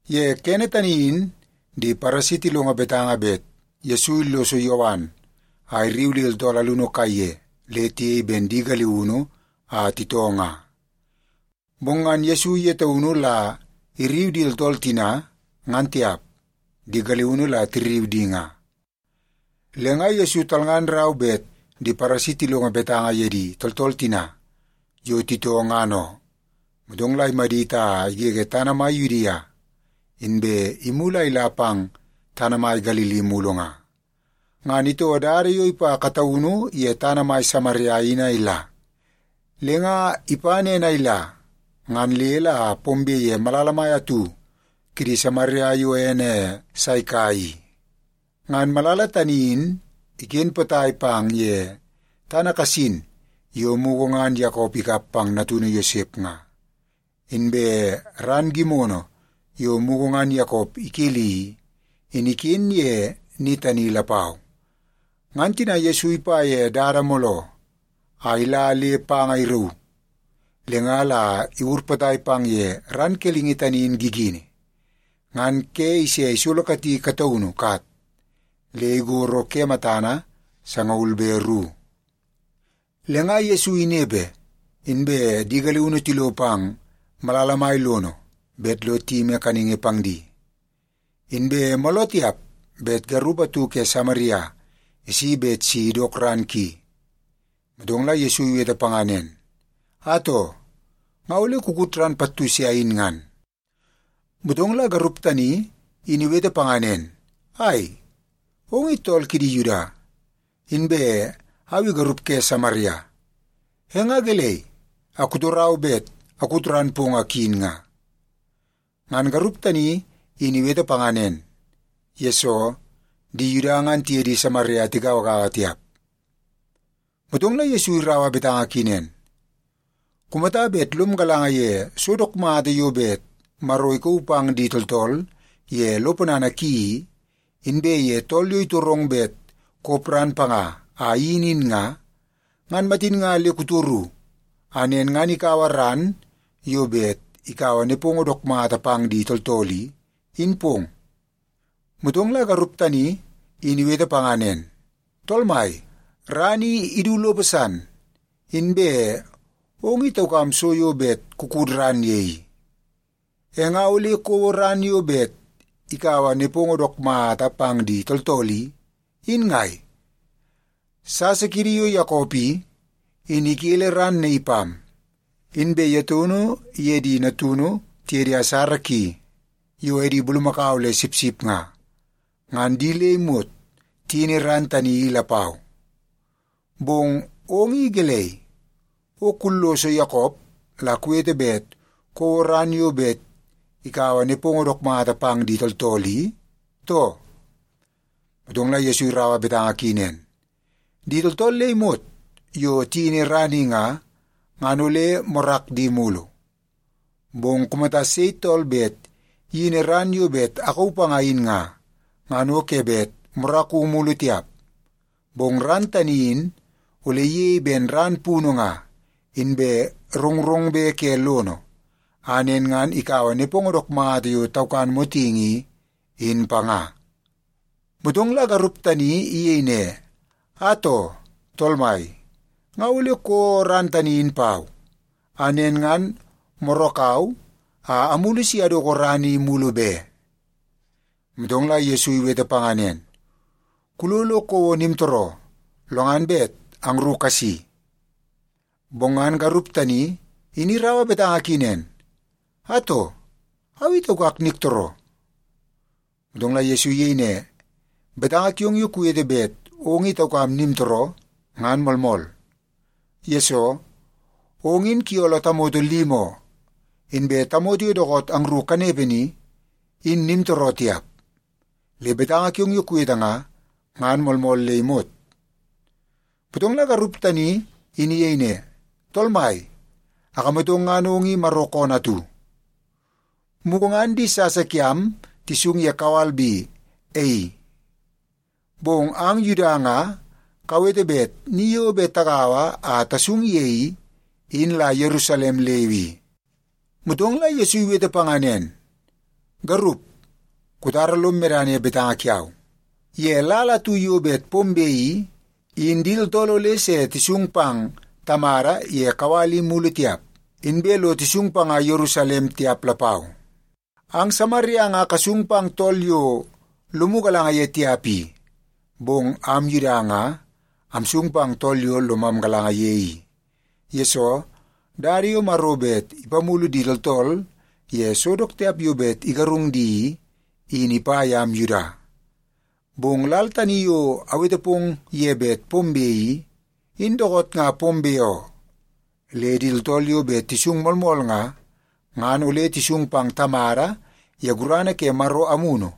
Ye kene tani in di Paresi tilongo betanga bet Yesu illoso Yowan a irriu di tooltool alunu kaiye le tiyei ben di galiunu a titoo nga. Bong ngan Yesu ye taunu la irriu di tooltool tina, ngan tiap, di galiunu la tirriu di nga. Le nga Yesu talngan rau bet di Paresi tilongo betanga ye di tooltool tina yo titoo ngan oo. Motong la imadit a igege tana mai Yudia, inbe imulu a ila pang tana mai Galili mulu nga. Ngan itoo dada yo ipa kataunu ye tana mai Samaria in a ila. Le nga ipa nen a ila, ngan le la pombe ye malala mai atu kidi Samaria yo ene Saika i. Ngan malala tani in iken potai pang ye tana kasin yo mugu ngan Yakop ikap pang natunu Yosep nga. Inbe ran gimono yo mugu ngan Yakop ikeli i, in iken ye ni tani lapau. Ngan tina Yesu ipa ye dada mooloo a ila le panga rauu, le nga la iwur potai pang ye ran kelingi tani in gigini. Ngan ke ise isolokati kataunu kat le igoro ke matana sangaul be ru. Le nga Yesu inepe, inbe di galiunu tilo pang malala mai lono bet lo tiyimi kaningi pang di. Inbe mooloo tiap bet garup atu ke Samaria isi bet si idok ran ki. Motong la Yesu iwete panga nen, “Atoo, nga ole kukut ran pattu se ayin ngan.” Motong la garup tani in iwete panga nen, “Ai, ong i tool kidi Yuda, inbe au i garup ke Samaria. E nga gelei a kutorau bet akut ran pong a kuyin nga?” (Ngan garup tani in iwete panga nen, yesoo di Yuda ngan tiye di Samaria tigauagaua tiap.) Motong la Yesu iraua betanga ki nen, “Kumata bet lom galanga ye so dook mata yo bet Maro ikauu pang di tooltool ye lo ponana ki i, inbe ye tool yo itorong bet kop ran panga a iyin in nga, ngan matin nga le kutoru a nen ngan ikaua ran yo bet ikaua nepongo dook mata pang di tooltool i, in pong.” Motong la garup tani in iwete panga nen, “Tool Mai, ran i idu lopo san, inbe ong i taukam so yo bet kukut ran ye i. E nga ole kouo ran yo bet ikaua nepongo dook mata pang di tooltool i, in ngai? Sasa kiidi yo Yakop i, in ikele ran naii pam. Inbe ye taunu iye di natunu tiye di asara ki yo edi bulumakau le sipsip nga, ngan di le imot tiyini ran tani i lapau. Bong ong i gelei, o kulloso Yakop la kuwete bet kouo ran yo bet ikaua nepongo dook mata pang di tooltool i, too?” Motong la Yesu iraua betanga ki nen, “Di tooltool le imot yo tiyini ran i nga, ngan ole morak di mulu. Bong kumata sei tool bet iyini ran yo bet akauu panga in nga, ngan o ke bet moraku mulu tiap. Bong ran tani in ole iyei ben ran punu nga, inbe rongrongbe ke lono, a nen ngan ikaua nepongo dook mata yo taukan motingi i, in panga.” Motong la garup tani iyei ne, “Atoo, Tool mai, nga ole kouo ran tani in pau, a nen ngan morakau a amulu si adoko ran i mulu be.” Motong la Yesu iwete panga nen, “Kulo lo kouo nimtooroo, lo ngan bet angru kasi.” Bong ngan garup tani in iraua betanga ki nen, “Atoo, au i taukak niktooroo.” Motong la Yesu iyei ne, “Betanga kiong yo kuwete bet ong i taukam nimtooroo, ngan moolmool. Yesoo, ong in kuyooloo tamoto limi oo, inbe tamoto yo dookoot angru kanepe ni, in nimtooroo tiap. Le betanga kiong yo kuwete nga, ngan moolmool le imot.” Motong la garup tani in iyei ne, “Tool mai, akamatong ngan ong i Maro koonoo atu. Mugu ngan di sasa kiam tisung ye kawal bi e i. Bong ang Yuda nga kawete bet ni yo bet tagaua a tasung ye i, in la Yerusalem leu i.” Motong la Yesu iwete panga nen, “Garup, kutara lom medana ye betanga kiau. Ye lal atu yo bet pombe i, in di tooltool ole se tisung pang Tamada ye kawal i mulu tiap, inbe lo tisung panga Yerusalem tiap lapau. Ang Samaria nga kasung pang tool yo lomu galanga ye tiap i. Bong am Yuda nga amsung pang tool yo lomam galanga ye i. Yesoo, dada yo Maro bet ipamulu di tooltool ye so dook tiap yo bet igarung di i, in ipa yam Yuda. Bong lal tani yo awete pong ye bet pombe i, in dookoot nga pombe oo. Le di tooltool yo bet tisung moolmool nga, ngan ole tisung pang Tamada ye gurana ke Maro Amunu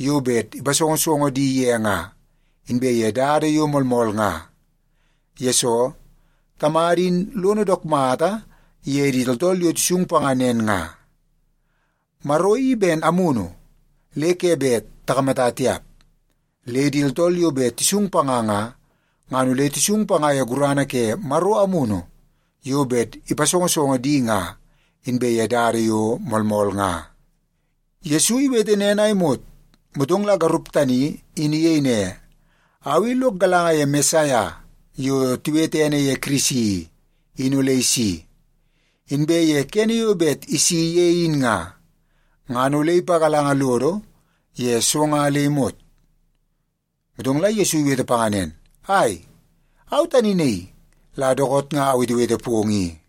yo bet ipasongosongo di ye nga, inbe ye dada yo moolmool nga. Yesoo, Tamada in lono dook mata ye di tooltool yo tisung panga nen nga. Maro i ben amunu le ke bet takamata tiap, le di tooltool yo bet tisung panga nga, ngan ole tisung panga ye gurana ke Maro Amunu yo bet ipasongosongo di nga, inbe ye dada yo moolmool nga.” Yesu iwete nen a imot, motong la garup tani in iyei ne, “Au i lok galanga ye Mesaia yo tiwete ene ye Kirisi i, in ole isi. Inbe ye kene yo bet isi ye in nga, ngan ole ipagalanga lodo ye so nga le imot.” Motong la Yesu iwete panga nen, “Ai, au tani naii la dookoot nga awetewete pong i.”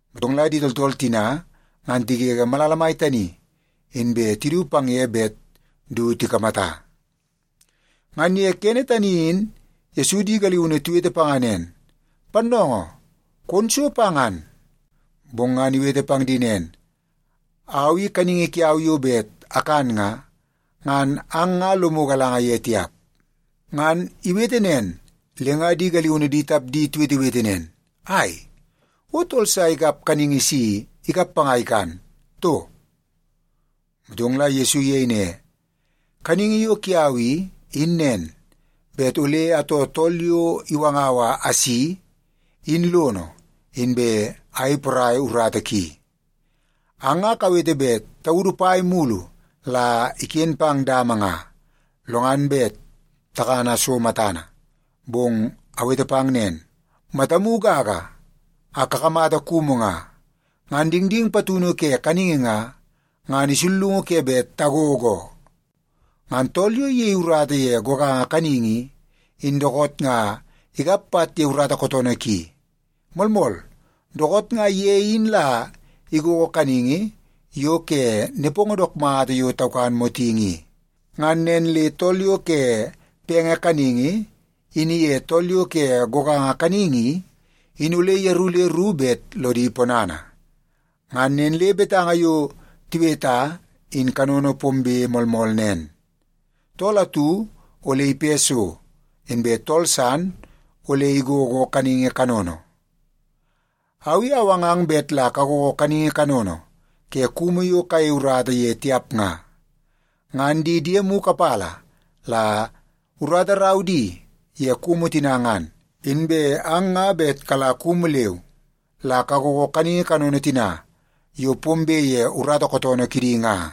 Motong la di tooltool tina ngan tigege malala mai tani, inbe tidu pang ye bet du tikamata. Ngan ye kene tani in Yesu di galiunu tiwete panga nen, “Pannoongoo, kon so pa ngan.” Bong ngan iwete pang di nen, “Au i kaningi kiau yo bet akan nga, ngan ang nga lomu galanga ye tiap.” Ngan iwete nen, le nga di galiunu di tapdi tiwetewete nen, “Ai, o tool sa ikap kaningi si ikap panga a ikan, too?” Motong la Yesu iyei ne, “Kaningi yo kiau i, in nen, bet ole atoo tool yo iwangau a asi, in lono, inbe ayei porai urata ki. Ang nga kawete bet taudu pai mulu la iken pang dama nga, lo ngan bet takana so matana. Bong awete pang nen, matamu gaga a kakamata kumu nga, ngan dingding patunu ke kaningi nga, ngan isullungu ke bet tagogo oo. Ngan tool yo iyei urata ye goganga kaningi i, in dookoot nga ikap pat ye urata kootoonoo ki. Moolmool, dookoot nga ye in la igogo kaningi yo ke nepongo dook mata yo taukan motingi i. Ngan nen le tool yo ke penge kaningi in iye tool yo ke goganga kaningi i, in ole yeru le ru bet lodi ponana. Ngan nen le betanga yo tiweta in kanono pombe moolmool nen, ‘Tool atu ole ipe so, inbe tool san ole igogo kaningi kanono.’ Au i awangang bet la kagogo kaningi kanono ke kumu yo kayei urata ye tiap nga. Ngan di diemu kapala la urata rau di ye kumu tina ngan, inbe ang nga bet kala kumu leu la kagogo kaningi kanono tina yo pombe ye urata kootoonoo kidi nga.”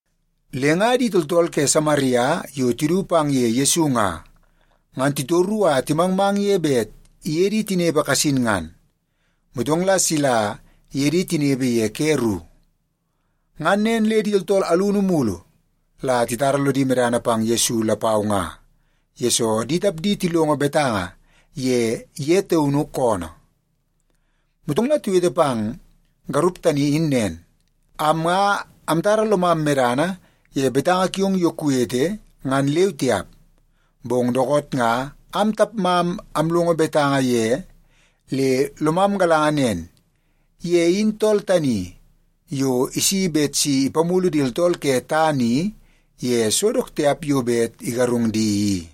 Le nga di tooltool ke Samaria yo tidu pang ye Yesu nga, ngan titoru a timangmang ye bet iye di tinepe kasin ngan. Motong la sila iye di tinepe ye ke ru. Ngan nen le di tooltool alunu mulu la titara lodi medana pang Yesu lapau nga, yesoo di tapdi tilongo betanga ye ye taun koonoo. Motong la tiwete pang garup tani in nen, “Am nga amtara lomam medana ye betanga kiong yo kuwete ngan leu tiap. Bong dookoot nga am tapmam amlongo betanga ye le lomam galanga nen: Ye in tool tani yo isi bet si ipamulu di tooltool ke tana i ye so dook tiap yo bet igarung di i.”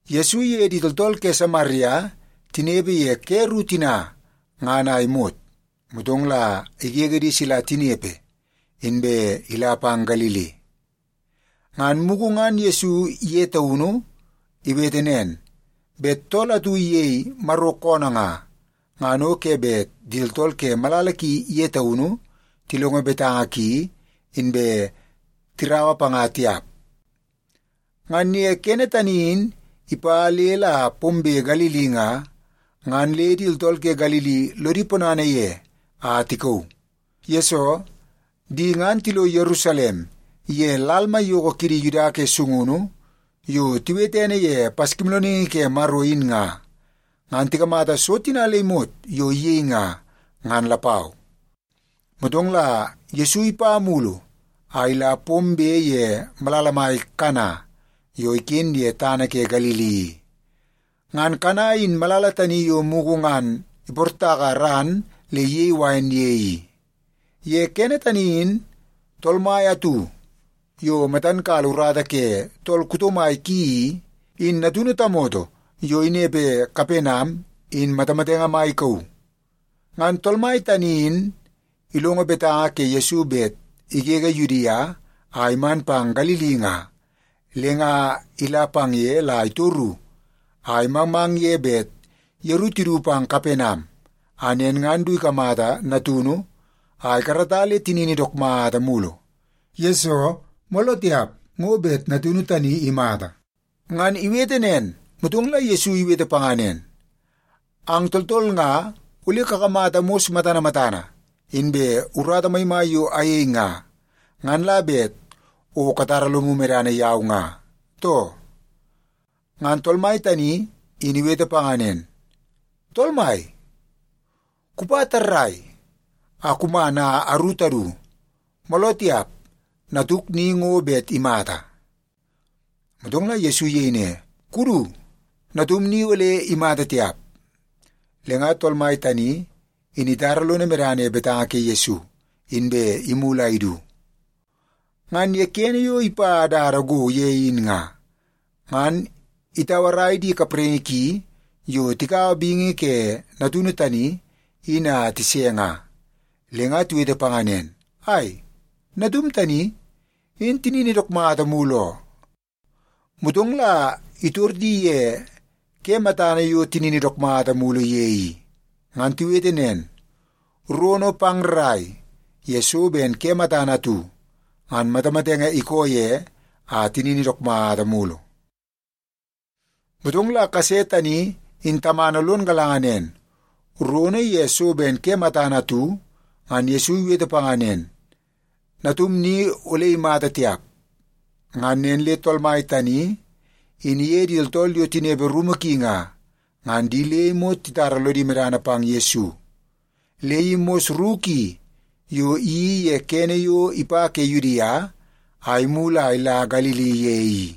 Yesu iye di tooltool ke Samaria tinepe ye ke ru tina ngan a imot, motong la igege di sila tinepe inbe ila pang Galili. (Ngan mugu ngan Yesu ye taunu iwete nen, bet tool atu iyei Maro koonoo nga, ngan o ke bet di tooltool ke malala ki ye taunu tilongo betanga ki inbe tiraua panga tiap.) Ngan ye kene tani in ipa le la pombe Galili nga, ngan le di tooltool ke Galili lodi ponana ye a tikauu. Yesoo, di ngan tilo Yerusalem ye lal maiyoko kidi Yuda ke sungunu yo tiwete ene ye Paskimoolooningi ke Maro in nga, ngan tikamata so tina le imot yo iyei nga, ngan lapau. Motong la Yesu ipa mulu a ila pombe ye malala mai Kana yo iken ye tana ke Galili i. Ngan Kana in malala tani yo mugu ngan iportaka ran le iyei wain ye i. Ye kene tani in tool mai atu yo matan kala urata ke tool kuto mai ki i, in natunu tamoto yo inepe Kapenam in matamatenge mai ikauu. Ngan tool mai tani in ilongo betanga ke Yesu bet igege Yudia a iman pang Galili nga, le nga ila pang ye la itoru a imangmang ye bet yeru tidu pang Kapenam, a nen ngan du ikamata natunu a ikarata le tinini dook mata mulu. Yesoo, mooloo tiap ngo bet natunu tani imata. Ngan iwete nen, motong la Yesu iwete panga nen, “Ang tooltool nga ole kakamata mos matana matana inbe urata maimai yo ayei nga, ngan la bet o katara lomu medana yau nga, too?” Ngan tool mai tani in iwete panga nen, “Tool mai, kupa tarrai a kuman a aru tadu, mooloo tiap natuk ni ngo bet imata.” Motong la Yesu iyei ne, “Kudu. Natum ni ole imata tiap.” Le nga tool mai tani in itara lono medana ye betanga ke Yesu, inbe imulu a idu. Ngan ye kene yo ipa dada go ye in nga, ngan itauarai di kapraingi ki yo tikaua bingi ke natunu tani in a tise nga. Le nga tiwete panga nen, “Ai, natum tani, in tinini dook mata mulu oo.” Motong la itor di ye ke matana yo tinini dook mata mulu ye i. Ngan tiwete nen, “Rono pang rrai ye so ben ke matana atu, ngan matamatenge ikoo ye a tinini dook mata mulu.” Motong la kase tani in tamana lon galanga nen, rono ye so ben ke matana atu, ngan Yesu iwete panga nen, “Natum ni ole imata tiap.” Ngan nen le tool mai tani in iye di tooltool yo tinepe rumu ki nga, ngan di le imot titara lodi medana pang Yesu. Le i mos ru ki yo iyeii ye kene yo ipa ke Yudia a imulu a ila Galili ye i.